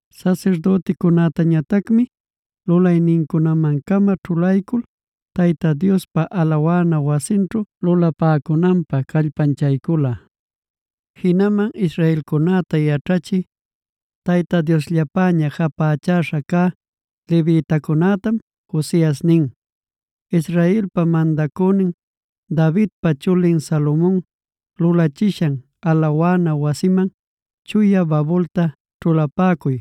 Sasirdüticunätañatacmi lulaynincunaman-cama ćhulaycul, Tayta Diospa alawana wasinćhu lulapäcunanpä callpanchaycula. Jinaman israelcunäta yaćhachï Tayta Diosllapäña japächäśha cä levitacunätam Josias nin: “Israelpa mandacünin Davidpa chulin Salomon lulachishan alawana wasiman chuya babulta ćhulapäcuy.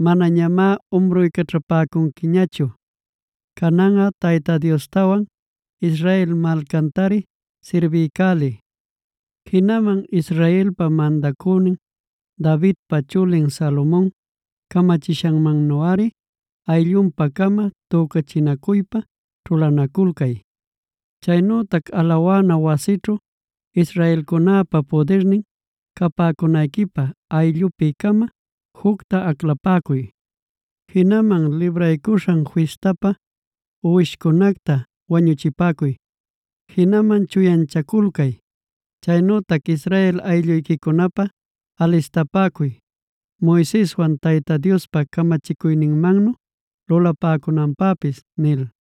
Manañamá umruycaćhapäcunquiñachu. Cananꞌa Tayta Diostawan Israel malcantari sirbiycäliy. Jinaman Israelpa mandacünin Davidpa chulin Salomon camachishanmannuꞌari ayllunpa-cama tücachinacuypa ćhulanaculcay.b Chaynütac alawana wasićhu israelcunäpa pudirnin capäcunayquipä ayllupi-cama jucta aclapäcuy. Jinaman Libraycuśhan Fistapä uwishcunacta wañuchipäcuy, jinaman chuyanchaculcay, chaynütac Israel aylluyquicunapä alistapäcuy Moiseswan Tayta Diospa camachicuyninmannu lulapäcunanpäpis” nil.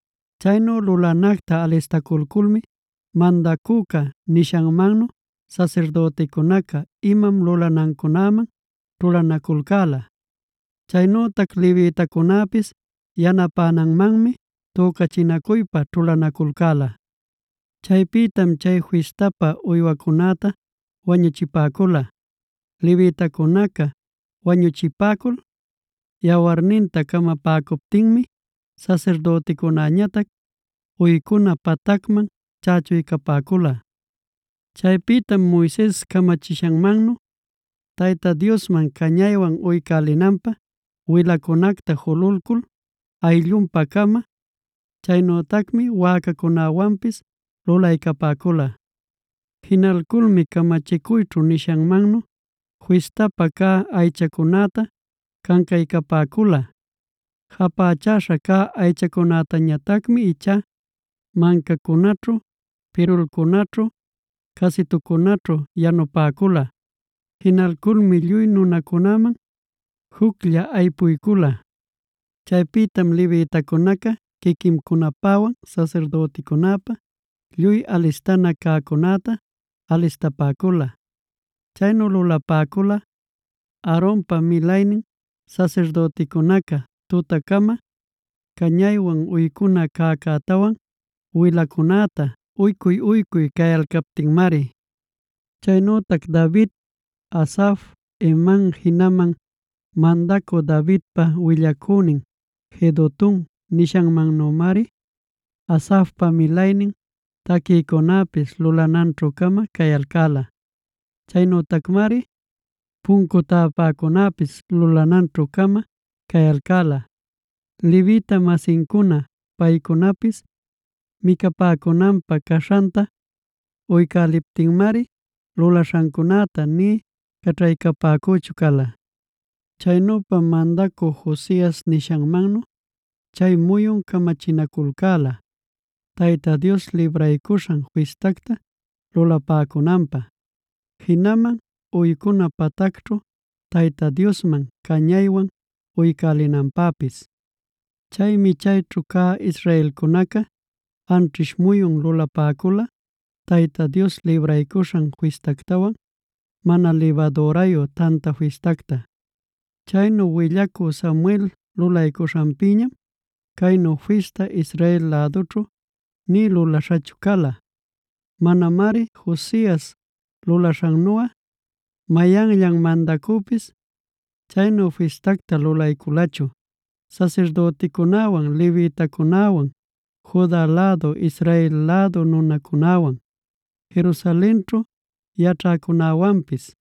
Chaynu lulanacta alistaculculmi mandacüca nishanmannu sasirdüticunaca imam lulanancunäman ćhulanaculcäla. Chaynütac levitacunäpis yanapänanmanmi tücachinacuypa ćhulanaculcäla. Chaypïtam chay fistapä uywacunäta wañuchipäcula. Levitacunaca wañuchipäcul yawarninta camapäcuptinmi sasirdüticunäñatac uycuna patacman chächuycapäcula. Chaypïtam Moises camachishanmannu Tayta Diosman cañaywan uycälinanpä wilancunacta jululcul ayllunpa-cama. Chaynütacmi wäcacunäwanpis lulaycapäcula. Jinalculmi camachicuyćhu nishanmannuc fistapä cä aychacunäta cancaycapäcula. Japächäśha cä aychacunätañatacmi ichá mancacunaćhu, pirulcunaćhu, casitucunaćhu yanupäcula. Jinalculmi lluy nunacunäman juclla aypuycula. Chaypïtam levitacunaca quiquincunapäwan sasirdüticunäpä lluy alistana cäcunäta alistapäcula. Chaynu lulapäcula Aaronpa milaynin sasirdüticunaca tutacama cañaywan uycuna cäcätawan wilacunäta uycuy-uycuy cayalcaptinmari. Chaynütac David, Asaf, Heman jinaman mandacü Davidpa willacünin Jedutun nishancunamannümarid Asafpa milaynin taquïcunäpis lulananćhu-cama cayalcäla. Chaynütacmari puncu täpäcunäpis lulananćhu-cama cayalcäla; levita-masincuna paycunapis micapäcunanpä caśhanta uycäliptinmari lulaśhancunäta nï caćhaycapäcüchu cala. Chaynüpam mandacü Josias nishanmannu chay muyun camachinaculcäla Tayta Dios Libraycuśhan Fistacta lulapäcunanpä, jinaman uycuna patacćhu Tayta Diosman cañaywan uycälinanpäpis. Chaymi chayćhu cä israelcunaca anćhish muyun lulapäcula Tayta Dios Libraycuśhan Fistactawan Mana libadürayu Tanta Fistacta.e Chaynu willacü Samuel lulaśhanpïñam caynu fista Israel lädućhu nï lulaśhachu cala. Manamari Josias lulaycuśhannuꞌa mayanllan mandacüpis chaynu fistactá lulayculachu sasirdüticunäwan levitacunäwan, Juda lädu Israel lädu nunacunäwan, Jerusalenćhu yaćhäcunäwanpis.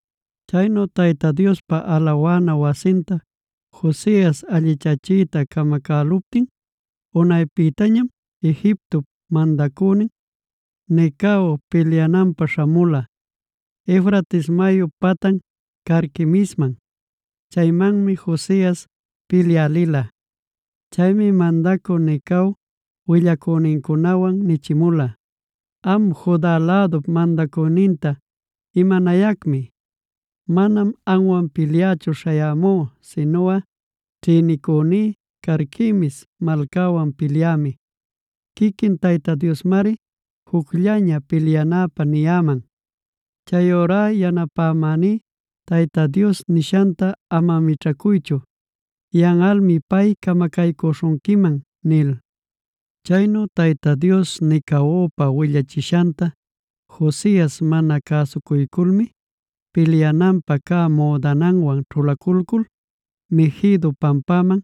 Chaynu Tayta Diospa alawana wasinta Josias allichachiyta camacäluptin unaypïtañam Egiptop mandacünin Necao pilyananpä śhamula, Eufrates mayup patan Carquemisman. Chaymanmi Josias pilyä lila. Chaymi mandacü Necao willacünincunawan nichimula: “Am, Juda lädup mandacüninta, ¿imanayacmi? Manam amwan pilyächu śhayämú sinuꞌa ćhinicüní Carquemis malcawan pilyämi. Quiquin Tayta Diosmari jucllaña pilyanäpä niyäman. Chayurá yanapamäní Tayta Dios nishanta ama mićhacuychu; yanꞌalmi pay camacaycüśhunquiman” nil. Chaynu Tayta Dios Necaopa willachishanta Josias mana cäsucuyculmi pilyananpä cä müdananwan ćhulaculcul Meguido pampaman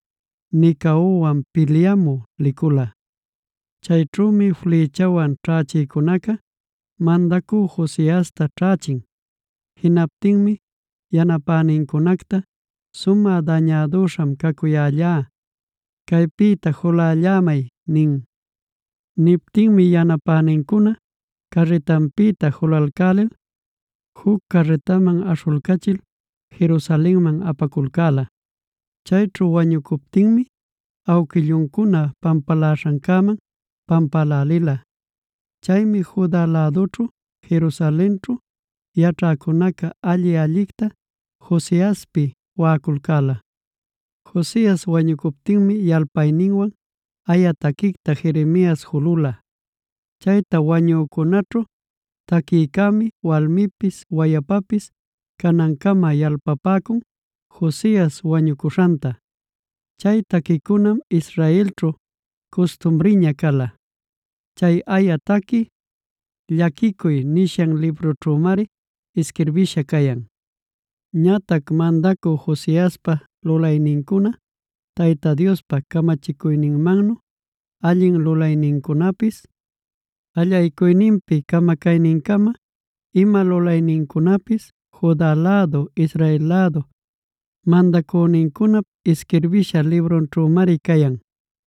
Necaowan pilyamü licula. Chayćhümi flïchawan ćhächïcunaca mandacü Josiasta ćhächin. Jinaptinmi yanapänincunacta: “Sumä dañädüśham cacuyällá; caypïta julällämay” nin. Niptinmi yanapänincuna carritanpïta julalcälil juc carritaman aśhulcachil Jerusalenman apaculcäla. Chayćhu wañucuptinmi awquilluncuna pampaläśhancäman pampälälila. Chaymi Juda lädućhu, Jerusalenćhu yaćhäcunaca alli-allicta Josiaspi waꞌaculcäla. Josias wañucuptinmi yalpayninwan aya taquicta Jeremiasf julula. Chayta wañücunaćhu taquïcämi walmipis wayapapis canancama yalpapäcun Josias wañucuśhanta. Chay taquicunam Israelćhu custumriña cala. Chay aya taqui Llaquicuy nishan librućhümari isquirbïsha cayan. Ñatac mandacü Josiaspa lulaynincuna Tayta Diospa camachicuyninmannu allin lulaynincunapis, allaycuyninpi camacaynincama ima lulaynincunapis Juda lädu Israel lädu mandacünincunap isquirbïsha librunćhümari cayan.